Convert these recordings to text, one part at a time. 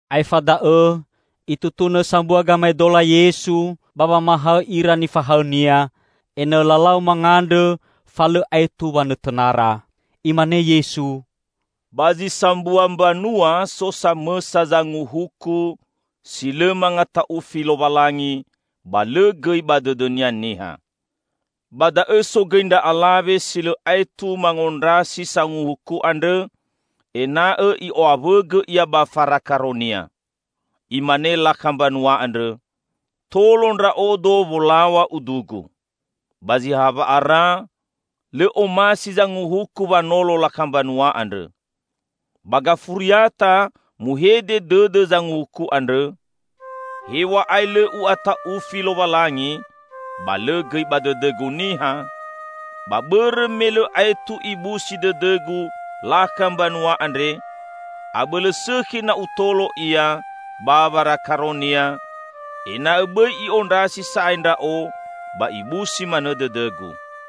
Aefa da'õ Itutunõ sambua gamaedola Yesu, ba wamahaõ ira nifahaõ-Nia, ena'õ lalau mangandrõ fa lõ aetu wanõtõnara. Imane Yesu, "Ba zi sambua mbanua so samõsa zanguhuku si lõ mangata'ufi Lowalangi, ba lõ gõi ba dõdõnia niha. Ba da'õ so gõi ndra alawe si lõ aetu mangondrasi sanguhuku andrõ ena'õ i'o'awõgõ ia ba farakaronia. Imane lakha mbanua andrõ, 'Tolo ndra'odo wolaw̃a udugu.' Ba zi ha wa'ara, lõ omasi zanguhuku wanolo lakha mbanua andrõ. Ba gafuriata muhede dõdõ zanguhuku andrõ, 'Hew̃a'ae lõ u'ata'ufi Lowalangi ba lõ gõi ba dõdõgu niha, ba bõrõ me lõ aetu ibusi dõdõgu lakha mbanua andre, abõlõ sõkhi na utolo ia ba warakaronia, ena'õ bõi i'ondrasi sa'ae ndra'o ba ibusi manõ dõdõgu.'"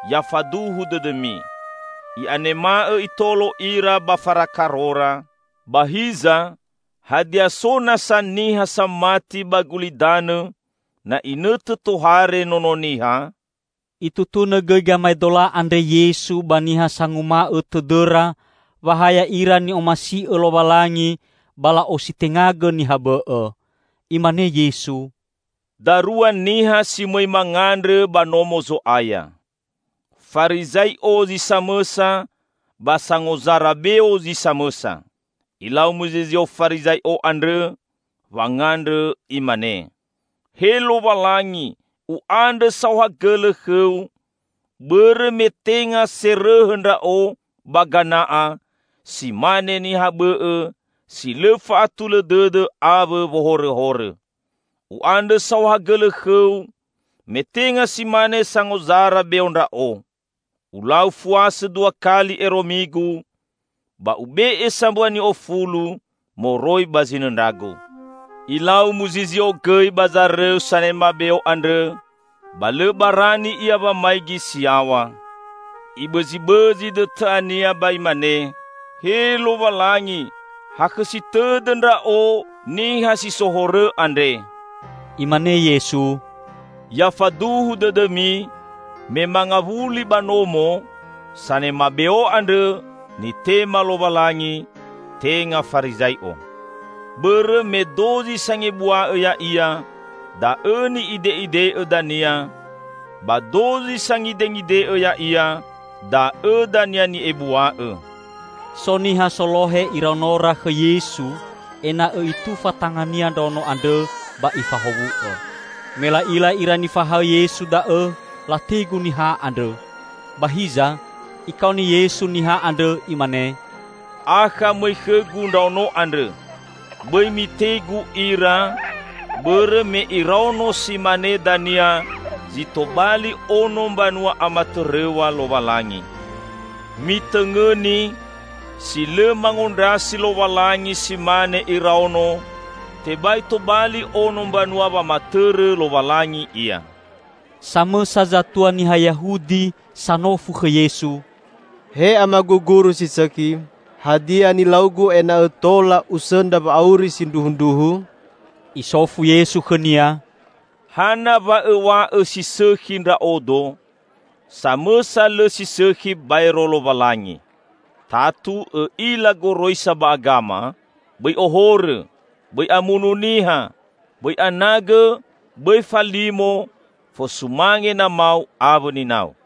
Ya faduhu dõdõmi: I'anema'õ Itolo ira ba farakarora! Ba hiza, hadia so nasa niha samati ba gulidanõ na inõtõ tohare Nono Niha?" Itutunõ gõi gamaedola andre Yesu ba niha sanguma'õ tõdõra wa ha ya'ira ni'omasi'õ Lowalangi ba la'ositengagõ niha bõ'õ. Imane Yesu, "Darua niha si mõi mangandrõ ba Nomo Zo'aya. Farizai'o zi samõsa ba sangozara beo zi samõsa. Ilau muzizio Farizai'o andrõ, wangandrõ imane, 'He Lowalangi u'andrõ saohagõlõ khõ-U, bõrõ me tenga serõhõ ndra'o ba gana'a si mane niha bõ'õ, si lõ fa'atulõ dõdõ awõ wohorõhorõ. U'andrõ saohagõlõ khõ-U me tenga si mane sangozara beo ndra'o. Ulau fuasõ dua kali ero migu, ba ube'e sambua ni'ofulu moroi ba zinõndragu.' Ilau muzizio gõi ba zarõu sanema beo andrõ ba lõ barani ia wamaigi si yaw̃a. Ibõzibõzi dõtõ'ania ba imane, 'He Lowalangi, hakhõsi tõdõ ndra'o niha si so horõ andre!'" Imane Yesu, "Ya faduhu dõdõmi, me mangawuli ba nomo, sanema beo andrõ nitema Lowalangi, tenga Farizai'o. Bõrõ me dozi sangebua'õ ya'ia da'õ ni'ide'ide'õ dania; ba dozi sangidengide'õ ya'ia da'õ dania ni'ebua'õ." So niha solohe iraonora khõ Yesu ena'õ Itufa tanga-Nia ndraono andrõ ba Ifahowu'õ. Me la'ila ira nifahaõ Yesu da'õ, lategu niha andrõ. Ba hiza, Ikaoni Yesu niha andrõ Imane, "Akha mõi khõ-Gu ndraono andrõ! Bõi mitegu ira, bõrõ me iraono si mane dania zi tobali ono mbanua amatõrõw̃a Lowalangi. Mitõngõni! Si lõ mangondrasi Lowalangi si mane iraono, tebai tobali ono Mbanua wamatõrõ Lowalangi ia." Samõsa zatua niha Yahudi sanofu khõ Yesu, "He Amagu Guru si sõkhi, hadia nilaugu ena'õ tola usõndra wa'auri sindruhundruhu?" Isofu Yesu khõnia, "Hana wa õw̃a'õ si sõkhi Ndra'odo? Samõsa lõ si sõkhi baero Lowalangi. Tatu õ'ila goroisa ba agama, 'Bõi ohorõ, bõi amunu niha, bõi anagõ, bõi falimo, fosumange namau awõ ninau.'"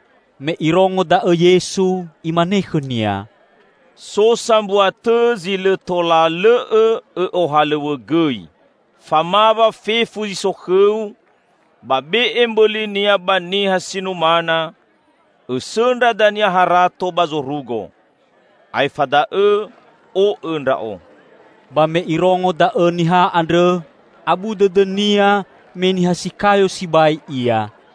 Me irongo da'õ Yesu, Imane khõnia, "So sambua tõ zi lõ tola lõ'õ õ'ohalõw̃õgõi: Famawa fefu zi so khõu, ba be'e mbõlinia ba niha si numana; õsõndra dania harato ba zorugo. Aefa da'õ o'õ Ndra'o." Ba me irongo da'õ niha andrõ, abu dõdõnia me niha si kayo sibai ia.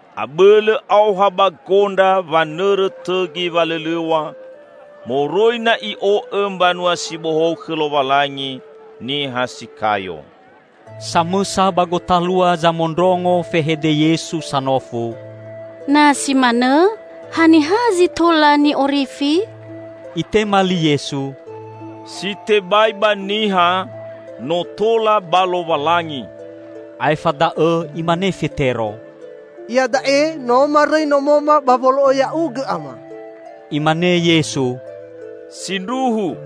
Abõlõ aoha ba gondra wanõrõ tõgi walõlõw̃a, moroi na i'o'õ Mbanua si Bohou khõ Lowalangi niha si kayo." Samõsa ba gotalua zamondrongo fehede Yesu sanofu, "Na si manõ haniha zi tola ni'orifi?" Itema li Yesu, "Si tebai ba niha, no tola ba Lowalangi!" Aefa da'õ imane Fetero, "Iada'e no marõi nomoma ba wolo'õ Ya'ugõ, Ama." Imane Yesu, "Sindruhu!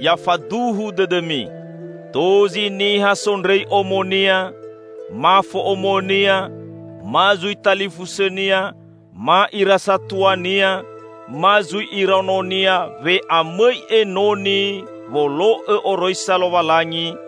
Ya faduhu dõdõmi: Dozi niha sondrõi omonia, ma fo'omonia, ma zui talifusõnia ma ira satuania ma zui iraononia we'amõi enoni wolo'õ oroisa Lowalangi,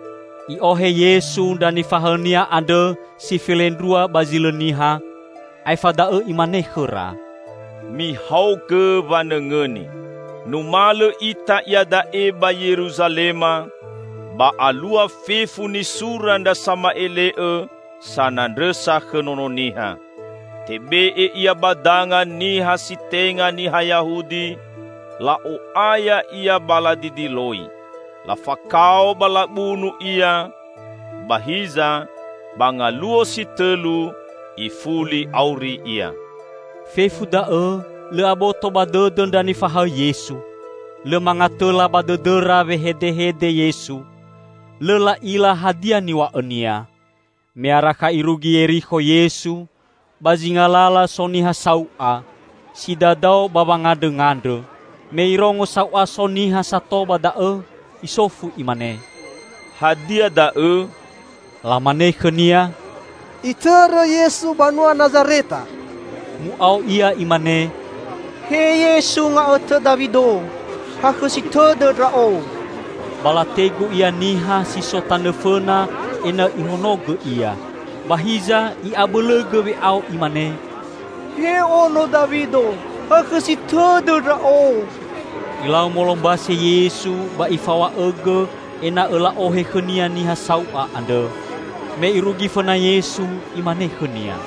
I'ohe Yesu ndra nifahaõ-Nia andrõ si felendrua ba zi lõ niha, aefa da'õ Imane khõra, "Mihaogõ wanõngõni! Numalõ ita iada'e ba Yeruzalema, ba alua fefu nisura ndra sama'ele'õ sanandrõsa khõ Nono Niha. Tebe'e Ia ba danga niha si tenga niha Yahudi, la'o'aya Ia ba ladidiloi. Lafakao ba labunu Ia; ba hiza, ba ngaluo si tõlu, ifuli auri Ia." Fefu da'õ lõ aboto ba dõdõ ndra nifahaõ Yesu. Lõ mangatõla ba dõdõra wehedehede Yesu. Lõ la'ila hadia niw̃a'õ-Nia. Me arakha irugi Yerikho Yesu, ba zinga lala so niha sau'a si dadao ba wangandrõngandrõ. Me irongo sau'a so niha sato ba da'õ, isofu imane, "Hadia da'õ?" Lamane khõnia, "Itõrõ Yesu banua Nazareta." Mu'ao ia imane, "He Yesu, nga'õtõ Dawido! Hakhõsi tõdõ ndra'o." Ba lategu ia niha si so tanõ fõna ena'õ ihonogõ ia. Ba hiza i'abõlõgõ we'ao imane, "He ono Dawido, hakhõsi tõdõ ndra'o!" Ilau molombase Yesu ba Ifaw̃a'õgõ ena'õ la'ohe khõ-Nia niha sau'a andrõ. Me irugi fõna Yesu, Imane khõnia,